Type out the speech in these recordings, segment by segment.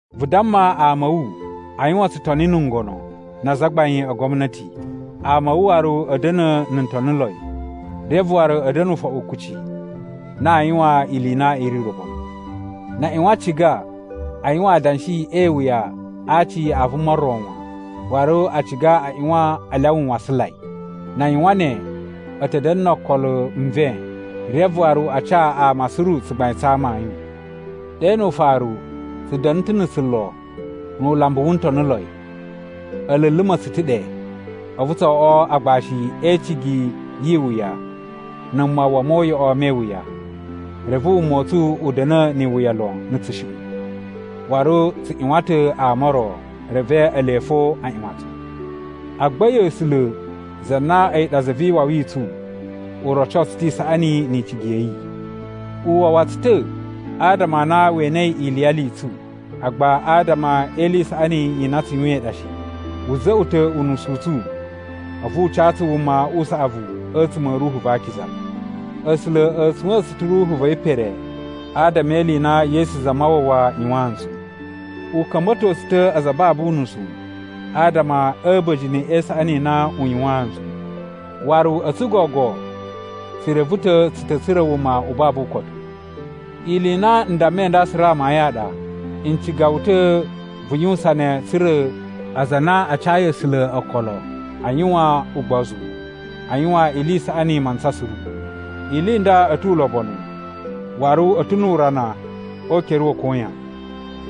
Vu damma ama a̱ wu a yuwan tsutoni na̱ ngono, na azagbain a gwamnati. Ama a̱ wu waru a̱ da̱na̱ na̱ ntoniloi, reve waru a̱ da̱na̱ ufoɓu kuci na aa yuwan ili i na i ri ulobonu. Na a ꞌyuwan a ciga a yuwan adanshi e iwuya a aci a vuma ro wan, waru a ciga a ꞌyuwan a lyawa nwasanlai. Na a yuwan ne, a̱ ta̱ da̱na̱ no okolo nven reve waru a ca ama suru tsugbain tsa amayun. Ɗe nu ufaru, tsu da̱na̱ ta̱ na̱ tsulo nu ulambu wu ntoniloi. A̱ luluma̱ tsu ta̱ ɗe, a̱vu tso oꞌwo agbashi e icigi yi iwuya na̱ mawwa mo uyoꞌo me iwuya. Reve wuma u tsu u da̱na̱ ni iwuya lon na̱ tsushuꞌun. Waru tsu ꞌyuwan ta̱ ama o ro, reve ele fo a ꞌyuwan tsu. Agba a̱yi A̱sula̱, za na a̱yi ɗa Za vi Iwawi i tsu, u roco tsu ta̱ isaꞌani ni icigi ya̱ yi. U wawa tsu ta̱ adama a na we enei iliyali i tsu, agba adama e ili i saꞌani i na tsu yuwain ɗa shi. Wu za̱ꞌwa̱ ta̱ unusu u tsu a̱vu u ca tsu wuma u saꞌavu a̱tsuma̱ a̱ Ruhu va Akiza. A̱sula̱ a̱ tsuwa̱a̱n tsu ta̱ Ruhu va̱ yi pere adama e ili i na Yesu Zamawawa yuwaan ntsu. U ka̱mba̱to tsu ta̱ aza a babu unusu adama a̱ a̱ba̱jini e isaꞌani i na u yuwaan ntsu. Waru a̱tsu gogo tsu reve ta̱ tsu ta̱ tsura̱ wuma u babu ukotu. Ili i na n dammai nda suru amayun a ɗa. N ciga wu ta̱ vu yuwusan ne tsa̱ra̱ aza a na a cayi A̱sula̱ okolo a yuwan ugbozu a yuwan ili i saꞌani mantsa suru. Ili i nda a̱ tu ulobonu waru a̱ ta̱ nu urana o ukere wa̱ koyan.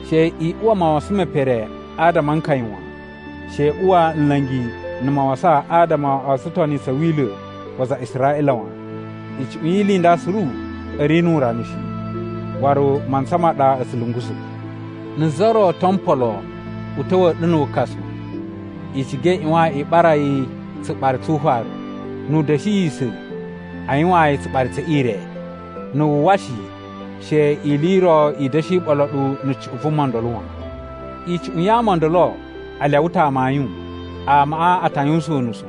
She i uwa mawasan me pere adama a nkaya wan. She i uwa nla̱ngi na̱ mawasan adama o tsutoni tsa̱ Wila̱ wa aza a Israꞌila wan. Icuꞌun yi ili i nda suru a̱ ri nu urana shi, waru mantsa ma ɗa a̱ tsu lungusa̱. Na̱ za ro to mpolo u ta̱wa̱a̱ ɗu na̱ wukasu, i ciga i ꞌyuwan i ɓara yi tsuɓari tsu ufaru, nu u da̱shiyisa̱ a yuwaan yi tsuɓari tse ire. Na̱ wu uwwa shi, she ili i ro i da̱shi ɓolo ɗu na̱ cuꞌun vuma ndolo wan. Icuꞌun ya ama o ndolo a lyawa ta̱ amayun. Amaꞌa a ta yuwusan unusu,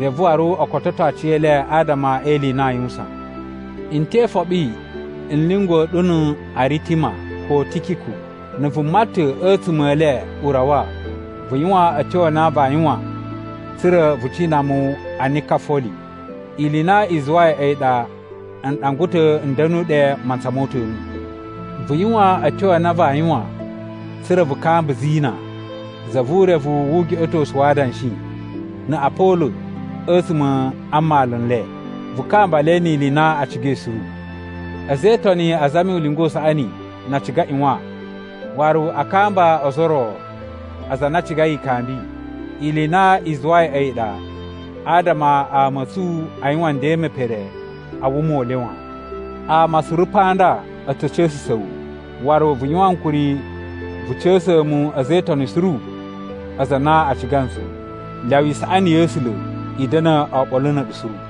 reve waru o kototo aciyele adama e ili i na aa yuwusan. N te ifoɓi n lyunguwa̱ ɗu na̱ Aritima ko Tikiku. Na̱ vuma ta̱ a̱tsuma̱ e le u rawa, vu yuwan a̱tyo a na vaa yuwan tsa̱ra̱ vu cina mu a Nikafoli. Ili i na i zuwai a̱yi ɗa n ɗangwa ta̱ n da̱nu ɗe mantsa mo uta̱nu. Vu yuwan a̱tyo a na vaa yuwan tsa̱ra̱ vu kamba Zina, za vu urevu wu ugeꞌetosu wa adanshi, na̱ Apolo a̱tsuma̱ a mmalu n le. Vu kamba le ni ili i na a cigai suru. A̱za̱ e Itoni a zami ulinga u saꞌani na a ciga a ꞌyuwan, waru a kamba ozo o ro aza a na a cigai ikambi. Ili i na i zuwai a̱yi ɗa adama ama a̱ tsu a yuwan nden me pere a wuma u le wan. Ama suru pa nda a̱ ta̱ ca̱sa̱sa̱ wu. Waru vu yuwan ankuri vu ca̱sa̱a̱ mu a̱za̱ e Itoni suru aza a na a ciga ntsu. Lyawa isaꞌani ya̱ A̱sula̱ i da̱na̱ oɓolo na̱ a̱ɗu suru.